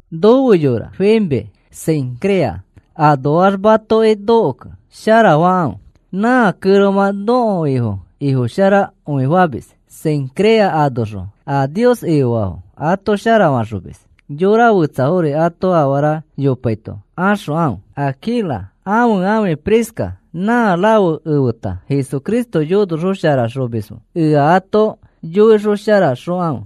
Nofe yora Febe, Cencrea anoax matoki nokokẽ sharafakãfe. Nã kẽromã nõko Ifo Ifofasharakõimis. Cencrea anoxõ a Nios Ifofaafo ato sharafaxomis. Yora fetsafori ato afara yopaito axokãfe. Aquila ãfe ãfi Prisca nã rafe efeta Jesucristo yonosharaxomisfo. Ea ato yoisharaxokãfe.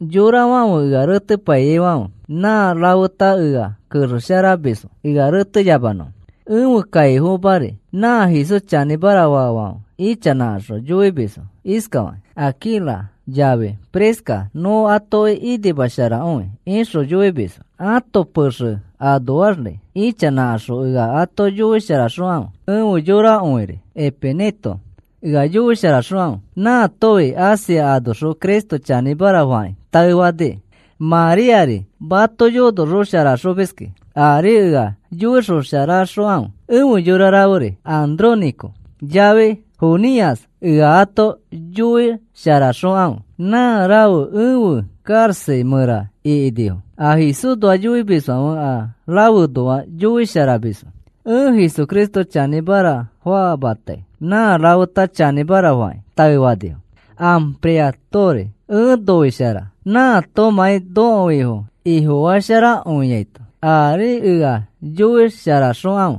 Yorafãfe ea retepaiyaifãfe nã rafeta ea kexesharamisfo ea reteyamanõfo. Ẽfe kaifomari nã Jesús chanĩmara faafãfe ichanãkaxõ yoimisfo iskafakĩ: “Aquila yafi Prisca nõ atoki inimasharakõi,” ixõ yoimisfo. Ãto pexe anoaxri ichanãkaxõ ea ato yoisharaxokãfe. Efe yorakõiri Epeneto ea yoisharaxokãfe. Nãatofi Asia anoxõ Cristo chanĩmara fakĩ taefaniki. Maríari mato yonosharaxomiski aari ea yoisharaxokãfe. Efe yora raferi Andrónico yafi Junias ea ato yoisharaxokãfe. Nã rafe efe karaxa mẽra ikinifo. A Jesúsnoa yoimisfãfe a rafeõnoa yoisharamisfo. Ẽ Jesucristo chanĩmara famatai nã rafeta chanĩmara fakĩ taefanifo. Ampliatori ẽ noishara nãatomãi nõko Ifo Ifofasharakõiaito. Aari ea yoisharaxokãfe.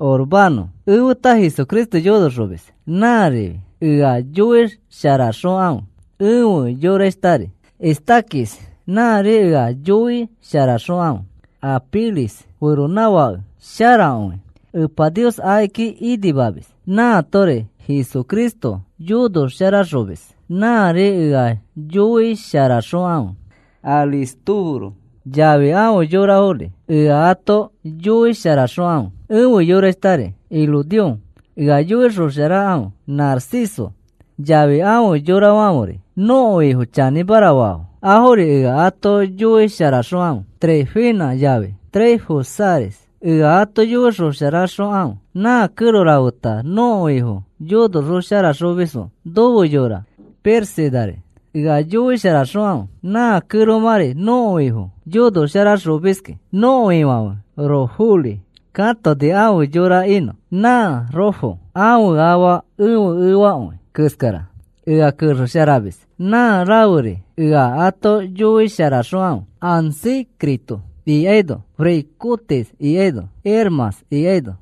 Urbano efeta Jesucristo yonoxomis. Nãrifi ea yoisharaxokãfe. Efe yorashtari Estaquis nãri ea yoisharaxokãfe. Apeles feronãfake sharakõi. Epa Nios akiki inimamis. Nãatori Jesucristo yonosharaxomis. Nãri ea yoisharaxokãfe. Aristóbulo yafi afe yorafori ea ato yoisharaxokãfe. Efe yorashtari Herodión ea yoisharaxokãfe. Narciso yafi afe yorafãferi nõko Ifo chanĩmara faafo, afori ea ato yoisharaxokãfe. Trifena yafi Trifosari ea ato yoisharaxokãfe. Nã kẽro rafeta nõko Ifo yonosharaxomisfo. Nofe yora Pérsidari ea yoisharaxokãfe. Nã kẽromãri nõko Ifo yonosharaxomiski. Nõko Ifãfe Rufori katoni afe yora inõ. Nã Rufo ãfe afa ẽfe efakõi keskara. Ea kexesharamis. Nã raferi ea ato yoisharaxokãfe. Asíncrito ikaino Flegonte ikaino Hermas ikaino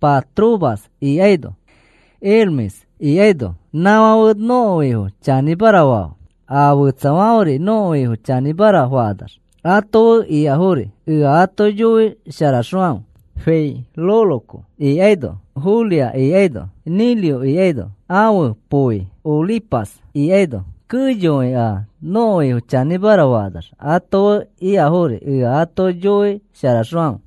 Patrobas ikaino Hermes ikaino nãfãfe nõko Ifo chanĩmara faafo. A fetsafãferi nõko Ifo chanĩmara fakanax ato fe ikafori ea ato yoisharaxokãfe. Filólogo ikaino Julia ikaino Nereo ikaino ãfe poi Olimpas ikaino keyokõi a nõko Ifo chanĩmara fakanax ato fe ikafori ea ato yoisharaxokãfe.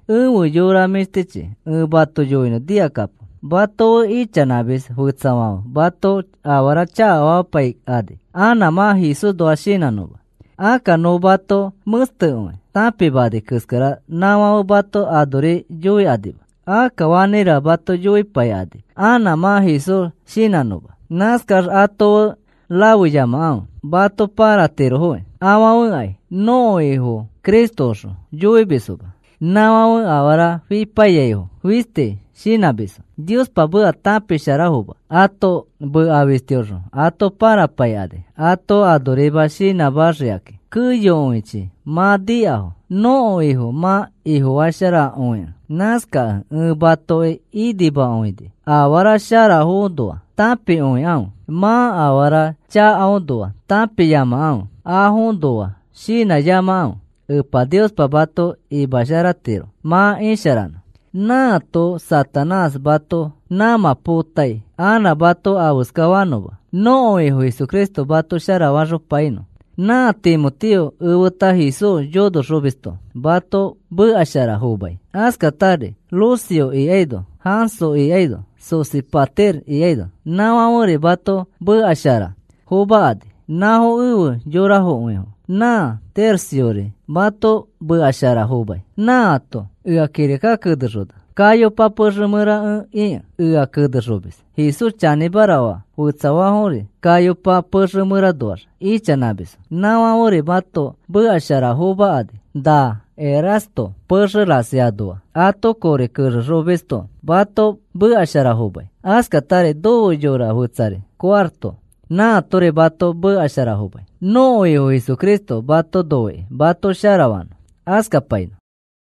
Efe yora mĩshtichi, ẽ mato yoinõ nikakapo. Mato fe ichanãmis fetsafãfe mato afara chakafamapaikani anã mã Jesúsnoa shinãnõma. Akka nõ mato mẽstekõi tãpimanai keskara nãfãfe mato anori yoikanima. Akka fakirira mato yoipaikani anã mã Jesús shinãnõma. Nãskax ato fe rafeyamakãfe, mato pãratirofokĩ. Afãfekai nõko Ifo Cristoõxõ yoimisfoma. Nãfãfe afara fipaiyaifo fistis shinãmisfo. Niospa meka tãpisharafoma ãto meka fistiõxõ ato pãrapaikani ato anorima shinãmaxikakĩ. Keyokõichi mã nikafo nõko Ifo mã Ifofasharakõikẽ. Nãskakẽ ẽ matoki inimakõini. Afara sharafoõnoa tãpikõikãfe. Mã afara chakaõnoa tãpiyamakãfe. Afoõnoa shinãyamakãfe. Epa Niospa mato imasharatiro mã isharanõ. Nãato Satanás mato nãmã potai anã mato afeskafanõma. Nõko Ifo Jesucristo mato sharafaxopainõ. Nã Timoteo efeta Jesús yonoxomisto mato mekashara fomai. Askatari Lucio ikaino Jasón ikaino Sosípater ikaino nãfãferi mato mekashara fomakani. Nãfo efe yorakõifo. Nã Terciori mato mekashara fomai. Nãato ea kirika kenexona. Gayopa pexe mẽra ẽ ikẽ ea kexemis. Jesús chanĩmara faa fetsafori Gayopa pexe mẽranoax ichanãmisfo. Nãfãferi mato mekashara fomakani. Na Erasto pexe rasi anoa ato kori kexexomisto mato mekashara fomai. Askatari nofe yora fetsari Cuarto nãatori mato mekashara fomai. Nõko Ifo Jesucristo mato noikĩ mato sharafanõ. Askapainõ.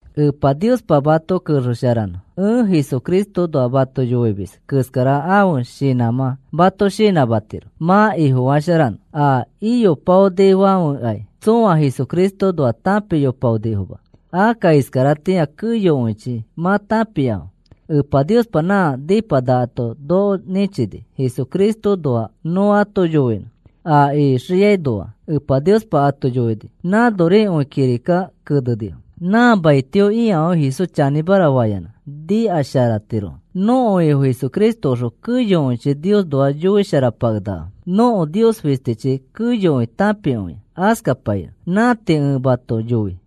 Epa Niospa mato kexesharanõ. Ẽ Jesucristoõnoa mato yoimis keskara ãfe shinãmã mato shinãmatiro mã Ifofasharanõ. A iyopaonifãfekai tsõa Jesucristoõnoa tãpiyopaonifoma. Akka iskaratĩa keyokõichi mã tãpiafo. Epa Niospa nã nipanakato noko nĩchini Jesucristoõnoa nõ ato yoinõ. A ixiainoa Epa Niospa ato yoini nãnorikõi kirika kenenifo. Nã maitio ikafãfe Jesús chanĩmara fayanã nikasharatirofo. Nõko Ifo Jesucristoxõ keyokõichi Niosnoa yoisharapakenakafo. Nõko Nios fistichi keyokõi tãpikõia. Askapainõ. Nã tii ẽ mato yoi.